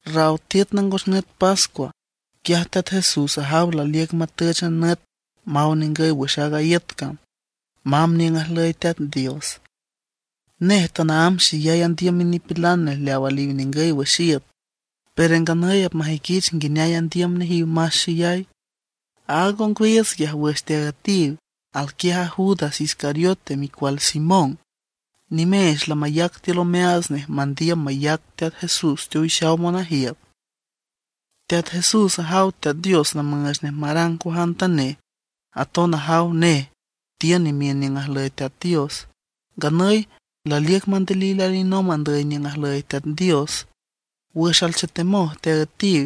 Raw tiüt nangos nüt pascua, quiaj Teat Jesús ajaw laliüc matüch a nüt maw ningüy wüx aaga iüt cam, mamb niüng ajlüy Teat Dios. Nej tanaámb xeyay andiüm minipilan nej leaw aliw ningüy wüx iüt, pero nganüy apmajüiquich nguineay andiüm nejiw mas xeyay. Aaga ongwiiüts quiaj wüx teaüetiw, alquiaj Judas Iscariote micual Simón. Nimeech lamayac tiül omeaats nej mandiüm mayac Teat Jesús teowixaw monajiüt. Teat Jesús ajaw Teat Dios lamüüch nej marang cuajantanej. Aton ajaw nej tiün imiün niüng ajlüy Teat Dios; nganüy laliüc mandilil alinomb andüy niüng ajlüy Teat Dios. Wüx alchetemoj teaüetiw,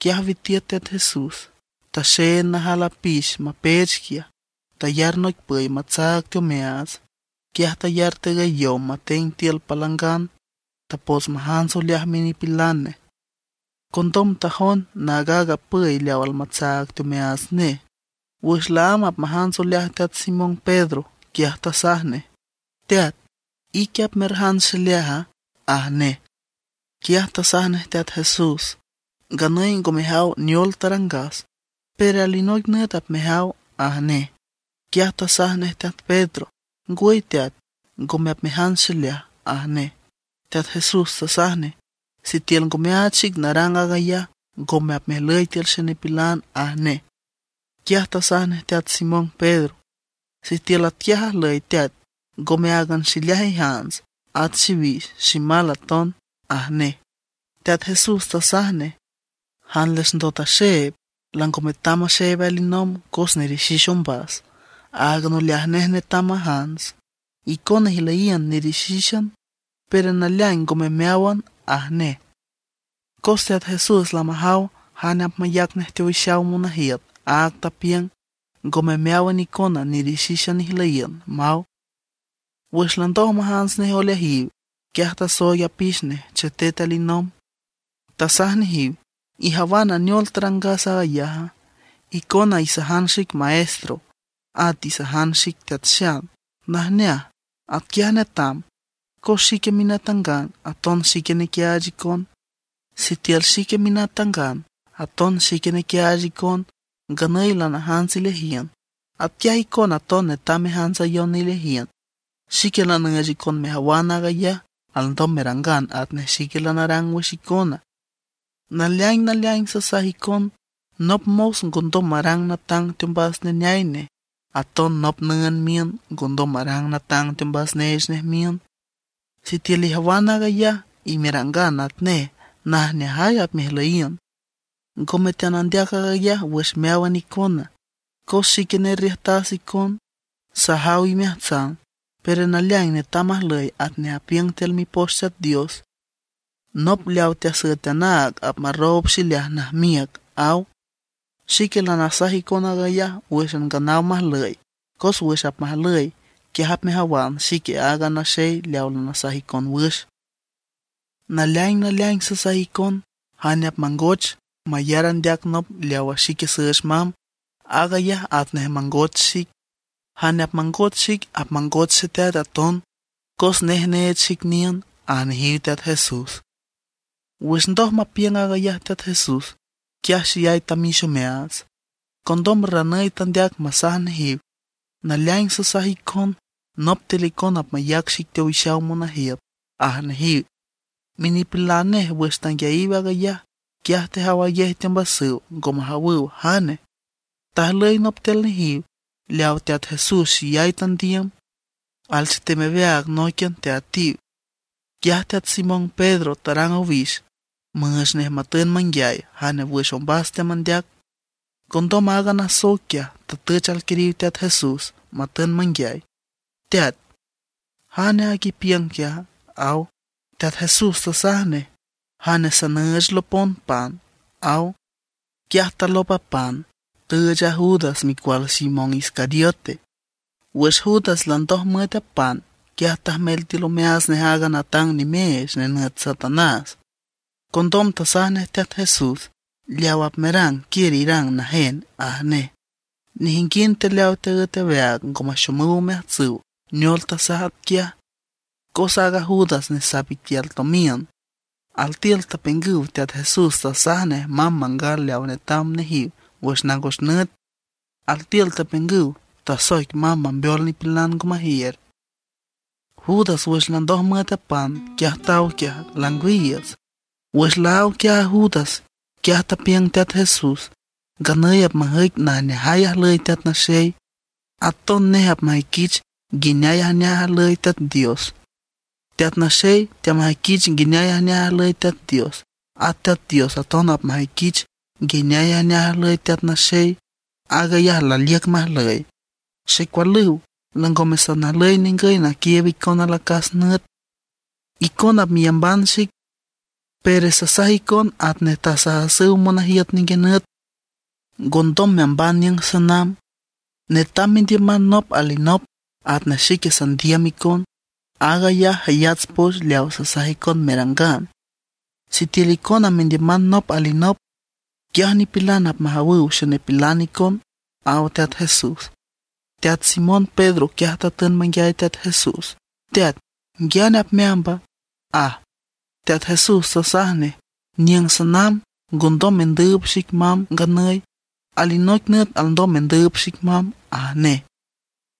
quiaj witiüt Teat Jesús, taxeend najal apix mapeech quiaj, tayar noic püy tatsaag teomeaats. Quiaj tayar tigüy yow mateng tiül palangan, tapots majants oleaj minipilan nej. Condom tajond naag aaga püy leaw almatsaag teomeaats nej. Wüx laámb apmajants oleaj teat Simón Pedro, quiaj tasaj nej: ―Teat, ¿ique apmerjants xileaja? ―aj nej. Quiaj tasaj nej Teat Jesús: ―Nganüy ngo mejaw neol tarangas, pero alinoic nüt apmejaw ―aj nej. Quiaj tasaj nej teat Pedro: ―Ngwüy teat, ngome apmejants xileaj ―aj nej. Teat Jesús tasaj nej: ―Sitiül ngo meaach xic narang aag ayaj, ngome apmejlüy tiül xenipilan ―aj nej. Quiaj tasaj nej teat Simón Pedro: ―Sitiül atquiaj ajlüy Teat, ngome áagan xileaj ijants, at xiwix, ximal aton ―aj nej. Teat Jesús tasaj nej: ―Jan les ndot axeeb lango metam maxeeb alinomb cos nerixix ombas, áagan oleaj nej netam majants. Icona ijlüyiün nerixixan, pero naleaing ngome meáwan ―aj nej. Cos Teat Jesús lamajaw jane apmayac nej teowixaw monajiüt, áag tapiüng: “Ngome meáwan icona nerixixan ijlüyiün”, maw. Wüx landoj majants nej oleajiw, quiaj tasooig apix nej chetet alinomb. Tasaj nejiw: ―¿Ijawana neol tarangas aaga yaja? Icona isajan xic Maestro, at isajan xic Teat Xan. Najneaj, atquiaj netam cos xique minatangan, aton xique nequiaach icon. Sitiül xique minatangan, aton xique nequiaach icon, nganüy lanajants ileajiün, atquiaj icona aton netam mejantsayon ileajiün. Xique lanüüch icon mejawan aag ayaj alndom merangan atnej xique lanarang wüx icona. Naleaing naleaing sasaj icon, nop mos ngondom marang natang teombas neneay nej. Aton nop nüünd miün ngondom marang natang teombas neech nej miün. Sitiül ijawan aag ayaj, merangan atnej, najneajay apmejlüyiün. ’Ngome teanandeac aag ayaj wüx meáwan icona, cos xique nerriüjtas icon, sajaw imeajtsan. Pero naleaing netam majlüy atnej apiüng tiül Mipoch Teat Dios: “Nop leaw teasüet anaag apmarroob xileaj najmiüc”, aw. Xique lanasaj icon aag ayaj wǘxan nganaw majlüy, cos wüx apmajlüy, quiaj apmejawan xique aaga naxey leaw lanasaj icon wüx. Naleaing naleaing sasaj icon, jane apmangoch mayar andeac nop leawa xique süüch mamb, aag ayaj atnej mangoch xic; jane apmangoch xic apmangoch Xeteat aton, cos nej neech xic niün ―aj nejiw Teat Jesús. Wüx ndoj mapiüng aag ayaj Teat Jesús, quiaj xeyay tamix omeaats. Condom ranüy tandeac masaj nejiw: ―Naleaing sasaj icon, nop tiül icona apmayac xic teowixaw monajiüt ―aj nejiw. Minipilan nej wüx tanguiayiw aag ayaj, quiaj tejawayej teombasüw, ngo majawüw jane. Tajlüy nop tiül nejiw leawa Teat Jesús xeyay tandiüm, alchetem aweaag nóiquian teaüetiw. Quiaj teat Simón Pedro tarang owix müüch nej matün manguiay jane wüx ombas teamandeac. Condom aaga nasoic quiaj tatüch alquiriw Teat Jesús, matün manguiay: ―Teat, ¿jane aag ipiüng quiaja? ―aw. Teat Jesús tasaj nej: ―Jane sanüüch lopon pan ―aw. Quiaj talop a pan, tüüch a Judas, micual Simón Iscariote. Wüx Judas landoj müet a pan, quiaj tajmel tiül omeaats nej aaga natang nimeech nenüt Satanás. Condom tasaj nej Teat Jesús: ―Leaw apmerang, quiür irang najen ―aj nej. Nejinguind tiül leaw teaǘet aweaag ngo maxomüw omeajtsüw neol tasaj atquiaj. Cos aaga Judas nesap iquial tomiün, altiül tapiüngüw Teat Jesús tasaj nej mamb mangal leaw netam nejiw wüx nangos nüt. Altiül tapiüngüw tasoic mamb mambeol nipilan ngo majiür. Judas wüx landoj müet a pan, quiaj taw quiaj, langwiiüts. Wüx laáw quiaj a Judas, quiaj tapiüng Teat Jesús: ―Nganüy apmajüic najneajay ajlüy Teat Naxey; aton nej apmajüiquich nguineay ajneaj ajlüy Teat Dios. Teat Naxey teamajüiquich nguineay ajneaj ajlüy Teat Dios, at Teat Dios aton apmajüiquich nguineay ajneaj ajlüy Teat Naxey; aag ayaj laliüc majlüy. Xecualüw, langome sanajlüy ningüy naquiiüb icon alacas nüt. Icona apmeyamban xic; pero sasaj icon atnej tasajasüw monajiüt ninguinüt: Ngondom meamban niüng sanamb. Netam mendiüman nop alinop atnej xique sandiüm icon. Aag ayaj jayats poch leaw sasaj icon merangan. Sitiül icona mendiüman nop alinop, quiaj nipilan apmajawüw xenipilan icon ―aw Teat Jesús. Teat Simón Pedro quiaj tatün manguiay Teat Jesús: ―Teat, ¿nguiane apmeamba? ―aj. Teat Jesús tasaj nej: ―Niüng sanamb, ngondom mendüüb xic mamb nganüy; alinoic nüt alndom mendüüb xic mamb ―aj nej.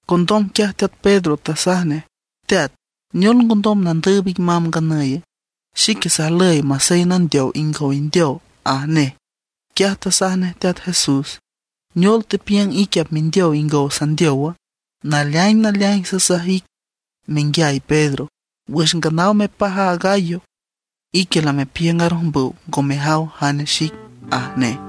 Condom quiaj teat Pedro tasaj nej: ―Teat, ¿neol ngondom nandüüb ic mamb nganüye? Xique sajlüy masey nandeow ingow indeow ―aj nej. Quiaj tasaj nej Teat Jesús: ―¿Neol tepiüng ique apmendeow ingow sandeowa? Naleaing naleaing sasaj ic menguiay Pedro, wüx nganaw mepaj a gallo, ique lamepiüng arojmbüw ngo mejaw jane xic ―aj nej.